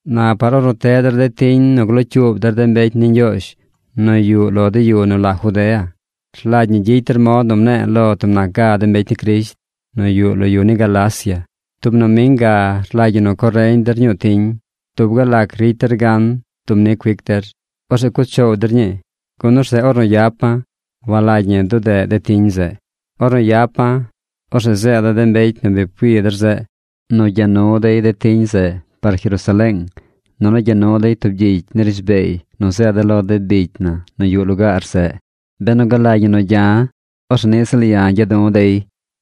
Na par ornu teꞌ der de tiñ nu glocyuub der de mbecy ni Ñgyoozh nu yuꞌ lo de yu nu la Judea, rlagy ñi gyicy der mod nu mne̱e̱ lo tub nac ga de mbecy ni Crisht nu yuꞌ lo de yu ni Galacia. Tub noming ga rlagy ñi nu co reñ der ñuu tiñ. Dub gal lac ricy der gan dub ni cuic der. Orzeꞌ cuꞌ choow der ñii, gun orzeꞌ ornu yapa̱, walagy ñi dudeꞌ de tiñ zeꞌ. Ornu yapa̱, orzeꞌ zeeda̱ de mbecy nu bi pcui der zeꞌ, nu cha nu dey de tiñ zeꞌ par Jerusaleeng, nunu cha nu dey tub gyicy ni rishbeey nu zeeda̱ lo de bicy na nu yuꞌ lugaar zeꞌ. Benu galagy ñi nu cha̱, orzeꞌ niꞌ ziꞌl ya̱ cha̱ du̱ dey.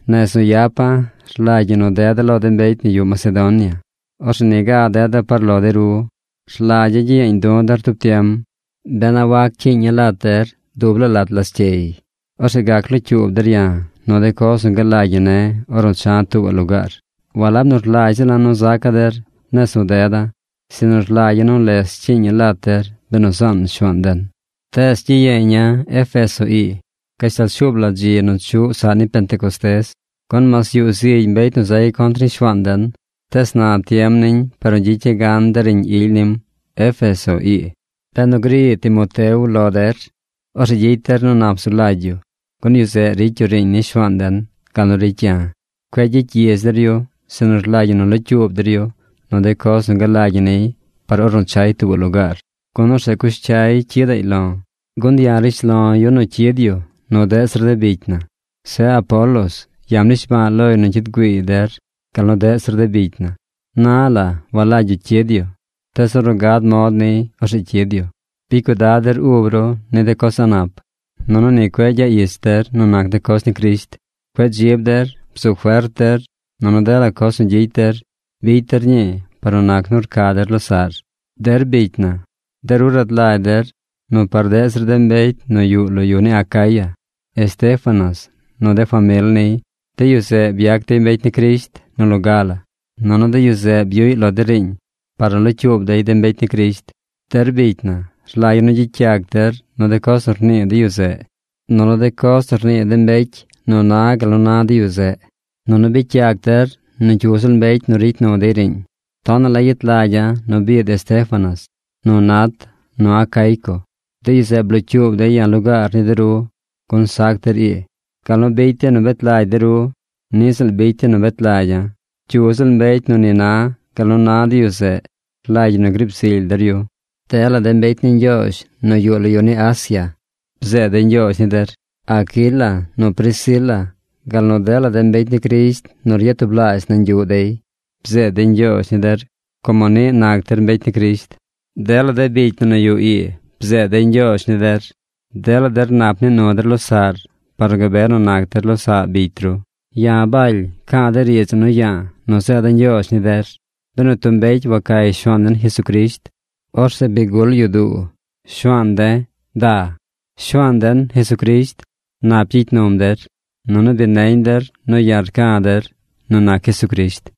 Nez nu yapa̱, rlagy ñi nu deda̱ lo de mbecy nu yuꞌ Macedonia. Orzeꞌ niga deda̱ par lo de ru. Rlagya̱ gyiyeeñ du̱ der tub tiem, ben a wac cyiiña̱ lat der dub laa lat lascyey. Orzeꞌ gac locyuub der ya̱ nu de coz nu galagy ñi ne̱ ornu cha̱ tuubaꞌ lugaar. Walab nu rlagy ziꞌl ya̱ nu zaca̱ der nez nu deda̱, sinu rlagya̱ nu les cyiiña̱ lat der benu zaan Shuaan den. Tees gyiyeeña̱ Éfeso ii gashtal shuub la dzi nu chuꞌ saꞌ ni Pentecostés. Gun mas yuꞌ zigy mbecy nu zay contr ni Shuaan den, tees na tiem niñ par nu gyicya̱ gan de riiñ ily nim Éfeso ii. Benu gri Timoteo lo der, orzeꞌ gyicy der nu nap zu lagy yu, gun yu zeꞌ ricy yu riiñ ni Shuaan den gal nu ricy ya̱. Cueꞌ gyicy gyidz der yu, sinu rlagy ñi nu locyuub der yu nu de coz nu galagy ñi niy par ornu chay tuubaꞌ lugaar, gun orzeꞌ cush cyay cyidaꞌy lo̱. Gun ya̱ rishlo̱ yu nu cyid yu nu deꞌ zir de bicy na. Zeꞌ Apolos, ya̱ mnishba̱a̱ loy nu cyid güiiy der gal nu deꞌ zir de bicy na. Na la walagy yu cyid yu. Tees ornu gad mod niy orzeꞌ cyid yu. Bicy cuidad der ub ru ni de coz a̱ꞌ nap. Nunu ni cueꞌ gyaꞌ ich der nu nac de coz ni Crisht. Cueꞌ dzib der. Bzu fert der. Nunu dela coz nu gyicy der, bicy der ñii par nu nac nu rca der losaꞌr. Der bicy na, de ru rad lagy der nu par deꞌ zir de mbecy nu yuꞌ lo yu ni Acaya, Estéfanas nu de famil niy, de yu zeꞌ byac dey mbecy ni Crisht nu loga la, nunu de yu zeꞌ byuꞌy lo de riiñ par nu locyuub dey de mbecy ni Crisht. Der bicy na, rlagya̱ nu gyicy yac der nu de coz nu rnii de yu zeꞌ, nunu de coz nu rnii de mbecy nu na gal nu na de yu zeꞌ. Nunu bicy yac der nu cyu ziꞌl mbecy nu ricy nu dey riiñ. Tonaꞌ la yet lagya̱ nu biid Estéfanas, nu Nat, nu Acaico. De yu zeꞌ blocyuub dey ya̱ lugaar ni de ru, gun sac der ii. Gal nu bicy dey nu bet lagy de ru, niꞌ ziꞌl bicy dey nu bet lagya̱. Cyu ziꞌl mbecy nu ni na gal nu na de yu zeꞌ rlagy ñi nu griib zily der yu. Dela de mbecy ni Ñgyoozh nu yuꞌ lo yu ni Asia, bzeed dey ñgyoozh ni der. Aquila nu Priscila gal nu dela de mbecy ni Crisht nu ryatublaazh nañ yuꞌ dey bzeed dey ñgyoozh ni der como niꞌ nac der mbecy ni Crisht. Dela de bicy na nu yuꞌ ii bzeed dey ñgyoozh ni der. Dela der nap nii nu der losaꞌr par nu gabe nu nac der losaꞌ bicy ru. Ya̱ Baly, ca̱a̱ de riidz ii nu ya̱a̱ nu zeeda̱ ñgyoozh ni der. Benu tub mbecy wacay Shuaan den Jesucrisht, orzeꞌ bi gul yu duu. ¡Shuaan de̱, da! Shuaan den, Jesucrisht, nap gyicy num der. Nunu bi neñ der nu ya̱ rca̱ der nu nac Jesucrisht.